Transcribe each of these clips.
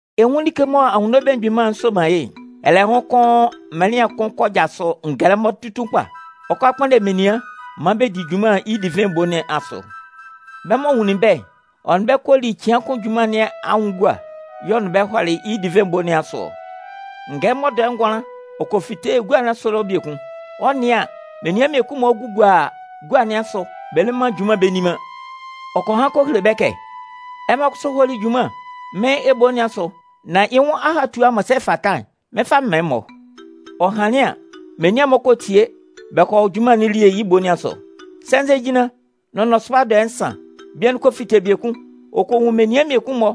“Ɛ 'nwun like mɔ Anwunno Belemgbin Mân'n soman yɩ́'n: Ɛlɛhʋn kʋn mɩnlɩan kʋn kɔ jasʋ ngɛlɛmɔ tutun kpa, ɔ 'kɔ a kpʋnndɛ menian maan bɛ di junman yɩ́ divɩn ebo nɩn asʋ. Bɛ́ m'ɔ nwunlin bɛ́'n, ɔ nʋn bɛ́ kɔ li cɩan kʋn junman nɩn anwʋn gua. Y'ɔ nʋn bɛ́ hɔlɩ yɩ́ divɩn ebo nɩn asʋ ɔ. “Ngɛlɛmɔ dɔɛ ngʋanlan ɔ kɔ fite gua nɩn asʋ ɛlɔ biekun. Ɔ 'nɩan an, menian mmiekun-mɔ gugua gua nɩn asʋ, bɛ le man junman bɛ nni man. Ɔ kɔ han kɔ hele bɛ́ kɛ: ‘Ɛmɔ kʋsʋ hɔ́ lí junman mɩ́n ebo nɩn asʋ nán yɩ́ nwʋn ahatua m'ɔ sɛ fata'n, mɩ́n 'fa mɩn man ɛmɔ.’ “Ɔ hanlɩn an, menian'n-mɔ kɔ tie bɛ kɔ hɔ junman nɩn elie yɩ́ ebo nɩn asʋ. Sɛnzɛjinlan nʋn nɔsʋba dɔɛ nsan, bian'n kɔ fite biekun, ɔ kɔ nwun menian mmiekun-mɔ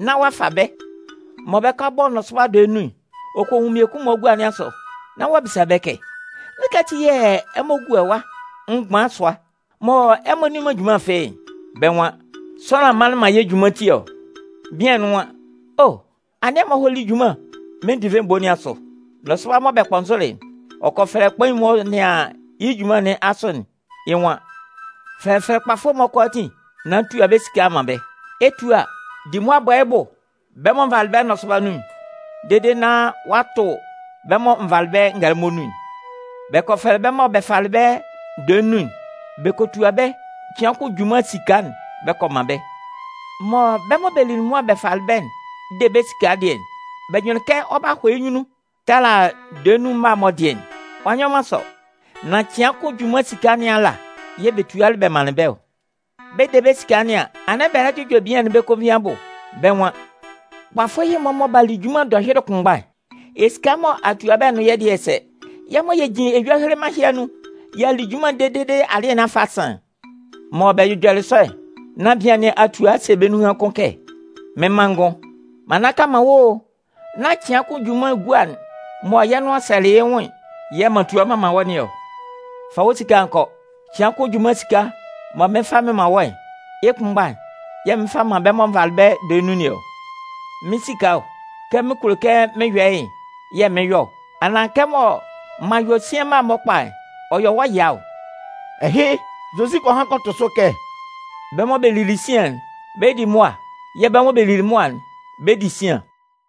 nán ɔ'a fa bɛ́. Mɔ bɛ 'kɔ a bɔ nɔsʋba dɔɛ nnun'n, ɔ kɔ nwun mmiekun-mɔ gua nɩn asʋ, nán ɔ'a bisa bɛ́ kɛ: ‘Nzukɛ ati yɛ̂ ɛmɔ gua ɛwa mgban sʋa mɔ ɛmɔ nni man junman fɩ́ɩ́'n?’ “Bɛ́ nwan: ‘Sʋanlan manlɩn man yɛ́ junman ti ɔ.’ “Bian'n nwan: ‘O, anɩn ɛmɔ hɔ́ lí junman mɩ́n divɩn ebo nɩn asʋ.’ “Nɔsʋba mɔ bɛ kpɔnzʋlɩ'n, ɔ kɔ fɛlɛ kpain'n m'ɔ nɩan yɩ́ junman nɩn asʋ'n, yɩ́ nwan: ‘Fɛfɛlɛ kpafʋ'n-mɔ kʋalaatin nán tua bɛ́ esika'n man bɛ́. Ɛ 'tua, di mʋa bɔ yɩ́ bʋ bɛ́ mɔ n valɩ bɛ́ nɔsʋba nun'n dede nán ɔ'a tʋ bɛ́ mɔ n valɩ bɛ́ ngɛlɛmɔ nun'n.’ “Bɛ kɔ fɛfɛlɛ bɛ́ mɔ bɛ falɩ bɛ́ dɔɛ nnun'n, bɛ kɔ tua bɛ́ cɩan kʋn junman esika'n bɛ kɔ man bɛ́. Mɔ bɛ́ mɔ bɛ lili mʋa bɛ falɩ bɛ́'n 'de bɛ́ esika dɩɛ'n, bɛ jʋnlɩn kɛ ɔ 'ba hɔ yɩ́ nyunnun tala dɔɛ nnun mma'n-mɔ dɩɛ'n. Ɔ'a nyɔ man sɔ, nan cɩan kʋn junman esika nɩn ala yɛ̂ bɛ tualɩ manlɩn bɛ́ ɔ. Bɛ 'de bɛ́ esika nɩn an, anɩn bɛ lɛ jʋjɔ bian'n bɛ́ konvin abʋ. Bɛ́ nwan: ‘Kpafʋ ɛhɩ-mɔ mɔ b'a li junman dɔhyʋɩlɩ kʋnmgba'n, esika'n mɔ a tua bɛ́'n nʋn yɛ́ dɩɛ'n sɛ, yɛ́ mɔ yɛ jin eyua heleman ɛhɩ anun y'a li junman dede alɩɛ nɩn a fa a san'n!’ “Mɔ bɛ jʋjɔlɩ sɔ'n nán bian nɩn a tua a se bɛ́ nunhan kʋn kɛ: ‘Mɩ́n manngʋn, m'an nnaka man wɔ́ o. Nán cɩan kʋn junman gua'n mɔ yɛ́ nʋan sɛlɩ yɩ́ nwʋn'n yɛ̂ m'an tua m'an man wɔ́ nɩn ɔ? Fa wɔ́ esika'n nán kɔ. Cɩan kʋn junman esika'n mɔ mɩɩn fa mɩn man wɔ́'n, yɩ́ kʋnmgba'n yɛ̂ mɩn 'fa mɩn man bɛ́ mɔ n valɩ bɛ́ dɔɛ nnun nɩn ɔ. Mɩ́n esika ɔ, kɛ mɩn kulo kɛ mɩn yɔ yɩ́'n yɛ̂ mɩn yɔ ɔ. Anaan kɛmɔ m'an yɔ sian mma'n-mɔ kpa'n, ɔ yɔ wɔ́ ɛya ɔ?’” Ɛhɩ, Zozi kɔ han kɔ tʋ sʋ kɛ: “Bɛ́ mɔ bɛ li sian'n, bɛ 'di mʋa yɛ̂ bɛ́ mɔ bɛ li mʋa'n, bɛ 'di sian.”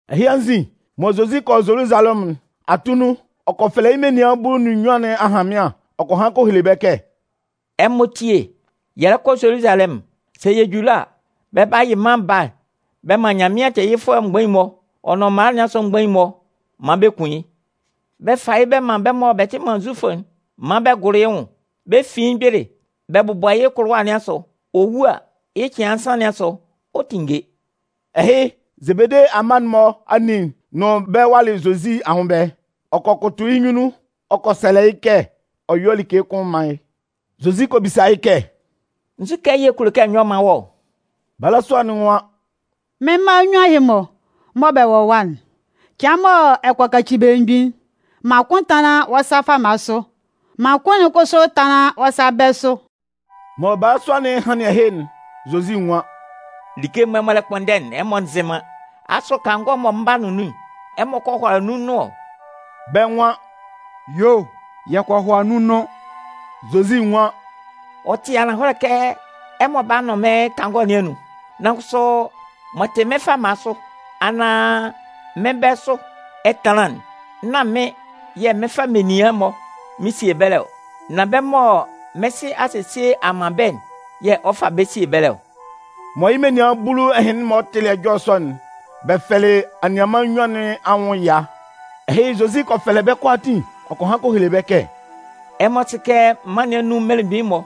Ɛhɩ anzin, mɔ Zozi 'kɔ Zoluzalɛmʋn'n, atunnun, ɔ kɔ fɛlɛ yɩ́ menian bulu nʋn nnyuan nɩn ahanmɩan, ɔ kɔ han kɔ hele bɛ́ kɛ: “Ɛmɔ tíe, yɛ lɛ kɔ Zoluzalɛmʋn. Sɛ yɛ ju ɛlɔ a, bɛ 'ba yɩ Mân Baa'n bɛ man Nyanmɩan tɛɛyɩfʋɛ mgbain'n-mɔ, ɔ nʋn mala nɩn asʋ mgbain'n-mɔ maan bɛ kun yɩ́. Bɛ 'fa yɩ́ bɛ man bɛ́ mɔ bɛ tɩ man Zufʋ'n maan bɛ gʋlʋ yɩ́ nwʋn, bɛ fin yɩ́ mgbele bɛ bʋbɔ yɩ́ kʋlʋwa nɩn asʋ. Ɔ wu a, yɩ́ cɩan nsan nɩn asʋ, ɔ 'tinnge.” Ɛhɩ, Zebede amma'n-mɔ anin nʋn bɛ́ walɩ Zozi anwʋn ɛbɛlɛ. Ɔ kɔ kʋtʋ yɩ́ nyunnun ɔ kɔ sɛlɛ yɩ́ kɛ ɔ yɔ́ like kʋn mán yɩ́. Zozi kɔ bisa yɩ́ kɛ: “Nzukɛ yɛ̂ ɛ kulo kɛ n yɔ́ m mán wɔ́ ɔ?” Balasua'n nwan: “Mɩ́n mma nnyuan ɛhɩ-mɔ mɔ bɛ wɔ ɛwa'n, cɩan mɔ ɛ kɔ kaci belemgbin'n, man kʋn tánlan wɔ́ sa fama sʋ, man kʋn'n kʋsʋ tánlan wɔ́ sa bɛ̂ sʋ.” Mɔ balasua'n hanlɩn ɛhɩ'n, Zozi nwan: “Like'n mɔ ɛmɔ lɛ kpʋnndɛ'n, ɛmɔ nzɩ man. Asʋ kangɔ'n mɔ mɩn 'ba nʋn nun'n, ɛmɔ kɔ hʋala nun nʋn ɔ?” Bɛ́ nwan: “Yuo, yɛ kɔ hʋala nun nʋn.” Zozi nwan: “Ɔ tɩ ananhɔlɛ kɛ ɛmɔ 'ba nʋn mɩ́n kangɔ nɩn anun, nan kʋsʋ m'ɔ tɩ mɩ́n fama sʋ, anaan mɩ́n bɛ̂ sʋ ɛtanlan'n, nán mɩ́n yɛ̂ mɩn fa menian'n-mɔ mɩn sie ɛbɛlɛ ɔ. Nan bɛ́ mɔ mɩ́n Sɩ a sesie a man bɛ́'n yɛ̂ ɔ 'fa bɛ́ sie ɛbɛlɛ ɔ.” Mɔ yɩ́ menian bulu ɛhɩnlɩn-mɔ tɩlɩ ɛjɔlɛ sɔ'n, bɛ fɛlɩ anianman nnyuan nɩn anwʋn ɛya. Ɛhɩ, Zozi kɔ fɛlɛ bɛ́ kʋalaatin ɔ kɔ han kɔ hele bɛ́ kɛ: “Ɛmɔ sɩ kɛ mân nɩn anun mmelemgbin'n-mɔ,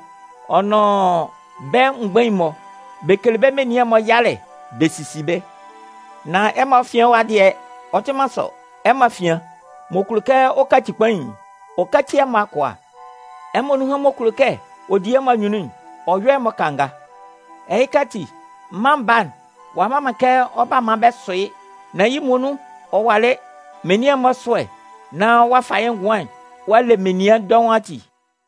ɔ nʋn bɛ́ mgbain'n-mɔ, bɛ kele bɛ́ menian'n-mɔ yalɛ bɛ sisi bɛ́. Nan ɛmɔ afian ɛwa dɩɛ, ɔ tɩ man sɔ. Ɛmɔ afian, m'ɔ kulo kɛ ɔ kaci kpain'n, ɔ káci ɛmɔ akʋa. Ɛmɔ nunhan m'ɔ kulo kɛ ɔ di ɛmɔ anyunnun'n, ɔ yɔ́ ɛmɔ kanga. Ɛhɩ ati, Mân Baa'n, ɔ'a mma man kɛ ɔ 'ba maan bɛ sʋ yɩ́, nan yɩ́ muonun ɔ walɩ menian'n-mɔ ɛsʋ́ɛ nán ɔ'a fa yɩ́ ngʋan'n ɔ'a le menian dɔʋn ati.”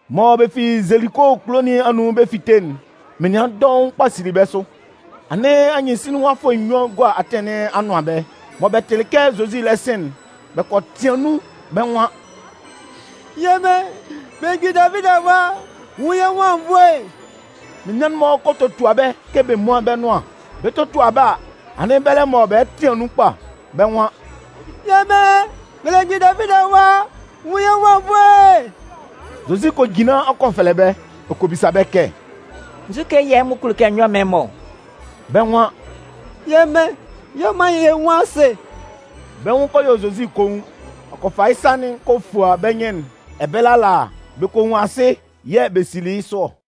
Mɔ bɛ fi Zeliko kulo nɩn anun bɛ 'fite'n, menian dɔʋn kpa sili bɛ́ sʋ. Anɩn anyɩnsinlinwafʋɛ nnyuan gua atɩn nɩn anʋan ɛbɛlɛ. Mɔ bɛ tɩlɩ kɛ Zozi lɛ sɩn'n, bɛ kɔ tɩan nun, bɛ́ nwan: “Yɛ́ Mɩn, belemgbin Davidi Awa, nwun yɛ́ nwʋn anwunnvoe!” Menian'n-mɔ kɔ totua bɛ́ kɛ bɛ múan bɛ́ nʋan. Bɛ 'totua bɛ́ a, anɩn bɛlɛ mɔ bɛ lɛ tɩan nun kpa, bɛ́ nwan: “Yɛ́ Mɩn, belemgbin Davidi Awa, nwun yɛ́ nwʋn anwunnvoe!” Zozi kɔ jinlan ɔ kɔ fɛlɛ bɛ́, ɔ kɔ bisa bɛ́ kɛ: “Nzu yɛ̂ ɛmɔ kulo kɛ n yɔ́ m mán ɛmɔ ɔ?” Bɛ́ nwan: “Yɛ́ Mɩn, yɔ maan yɛ nwún asɩ.” Bɛ́ nwʋn kɔ yɔ Zozi koun. Ɔ kɔ fa yɩ́ sa'n kɔ fua bɛ́ nyɩn'n. Ɛbɛlɛ ala, bɛ kɔ nwun asɩ yɛ̂ bɛ sili yɩ́ sʋ ɔ.